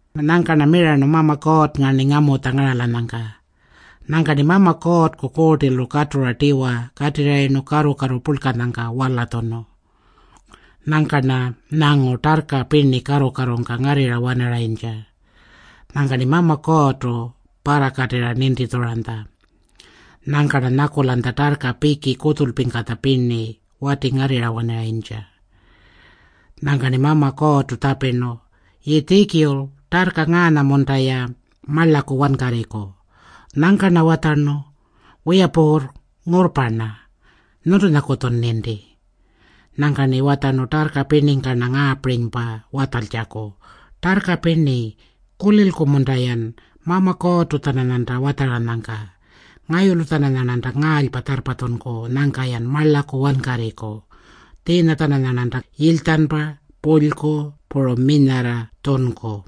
Nyangka-rna mirarnu Mama Kuurrnga-rni ngamutja ngaralanyangka. Nyangka-rni Mama Kuurrku Kuurtilu katura tiwa katirrayirnu karru-karru purlkanyangka walatjunu. Nyangka-rna nyangu tarrka pirni karru-karrungka ngarrirra-wanarayintja. Nyangka-rni Mama Kuurrtu parrakatirra nintitjuranytja. Nyangka-rna nyakulanytja tarrka piki kutjulpingkatja pirninya watingarrirra-wanarayintja. Nyangka-rni Mama Kuurrtu tjapirnu, “Yiitjikul, tarrka ngaanya-munta-ya marlaku wankarriku?” Nyangka-rna watjarnu, “Wiya Puurr, ngurrpa-rna. Nyuntunyakutjun ninti.” Nyangka-rni watjarnu tarrka pirningka-rna ngaapirinypa watjaltjaku, “Tarrka pirni, kulilku-munta-yan Mama Kuurrtu-tjananyanta watjaranyangka? Ngayulu-tjananyarnanta ngaalypa tjarrpatjunku nyangka-yan marlaku wankarriku. Tjiinya-tjananyarnanta yilytjanpa, pulyku puru minyarra tjunku.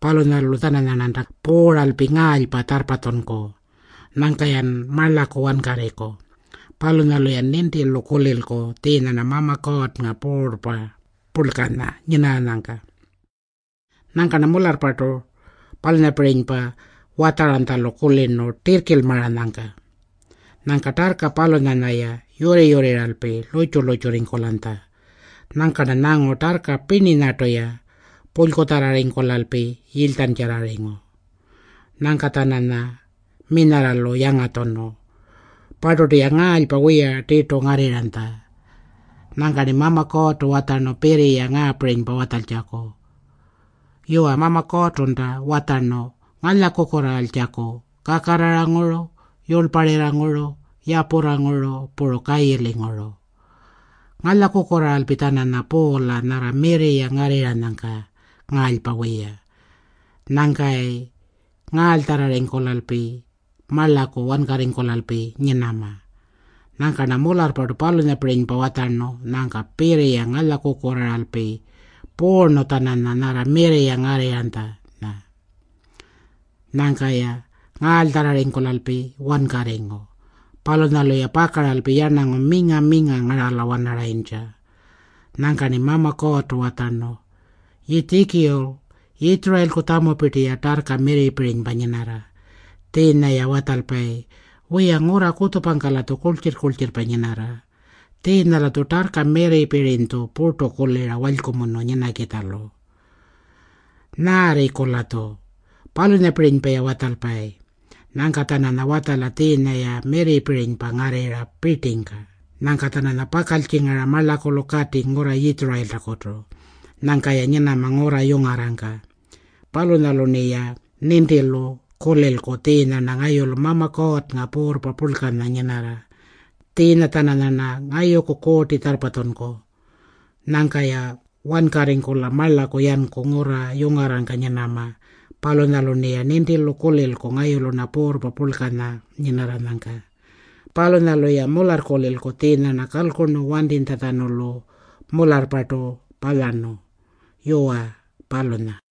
Palunyalu-tjananyarnanta puuralpi ngaalypa tjarrpatjunku. Nyangka-yan marlaku wankarriku. Palunyalu-yan nintilu kulilku tjiinya-rna Mama Kuurrnga Puurrpa purlkanya nyinarranyangka.” Nyangka-rna mularrpartu palunyapirinypa watjaranytjalu kulirnu tirrkilmaranyangka. Nyangka tarrka palunyanya-ya yurri-yurrirralpi lurrtju-lurrtjurringkulanytja. Nyangka-rna nyangu tarrka pirninyartu-ya pulykutjarrarringkulalpi yilytjantjarrarringu. Nyangka-tjananya minyarralu yangatjunu. Parturtu-ya ngaalypa wiya tirtu ngarrirranytja. Nyangka-rni Mama Kuurrtu watjarnu pirriya ngaapirinypa watjaltjaku, “Yuwa, Mama Kuurrtunta watjarnu ngalyakukurraaltjaku kakarraranguru, yurlparirranguru, yapurranguru, puru kayilinguru. Ngalyakukurraaralpi-tjananya puula nyarra mirri-ya ngarrirranyangka ngaalypa wiya. Nyangka-yayi ngaalytjarrarringkulalpi marlaku wankarringkulalpi nyinama.” Nyangka-rna mularrpartu palunyapirinypa watjarnu. Nyangka pirriya ngalyakukurraaralpi puurnu-tjananya nyarra mirri-ya ngarrinytjanya. Nyangka-ya ngaalytjarrarringkulalpi wankarringu. Palunyalu-ya pakaralpi yarnangu minga-minga ngarala-wanarayintja. Nyangka-rni Mama Kuurrtu watjarnu, “Yiitjikul, Yitjurayilku tjamupirti-ya tarrka mirripirinypa nyinarra. Tjiinya-ya watjalpayi, ‘Wiya, ngurra kutjupangka-latju kurltjirr-kurltjirrpa nyinarra. Tjiinya-latju tarrka mirripirinytju purtu kulira walykumunu nyinakitjalu. Nyaarriku-latju?’ Palunyapirinypa-ya watjalpayi. Nyangka-tjananya watjala tjiinya-ya mirripirinypa ngarrirra pirtingka. Nyangka-tjananyarna pakaltjingara marlakulu katiku ngurra Yitjurayiltakutu. Nyangka-ya nyinama ngurra yungarrangka. Palunyalu-rniya nintilu kulilku tjiinya-rna ngayulu Mama Kuurrnga Puurrpa Purlkanya nyinarra. Tjiinya-tjananyarna ngayuku kuurti tjarrpatjunku. Nyangka-ya wankarringkula marlaku yanku ngurra yungarrangka nyinama. Palunyalu-rniya nintilu kulilku ngayulu-rna Puurrpa Purlkanya nyinarranyangka. Palunyalu-ya mularrkulilku tjiinya-rna kalkurnu wantitjatjanulu mularrpartu palyarnu.” Yuwa, palunya.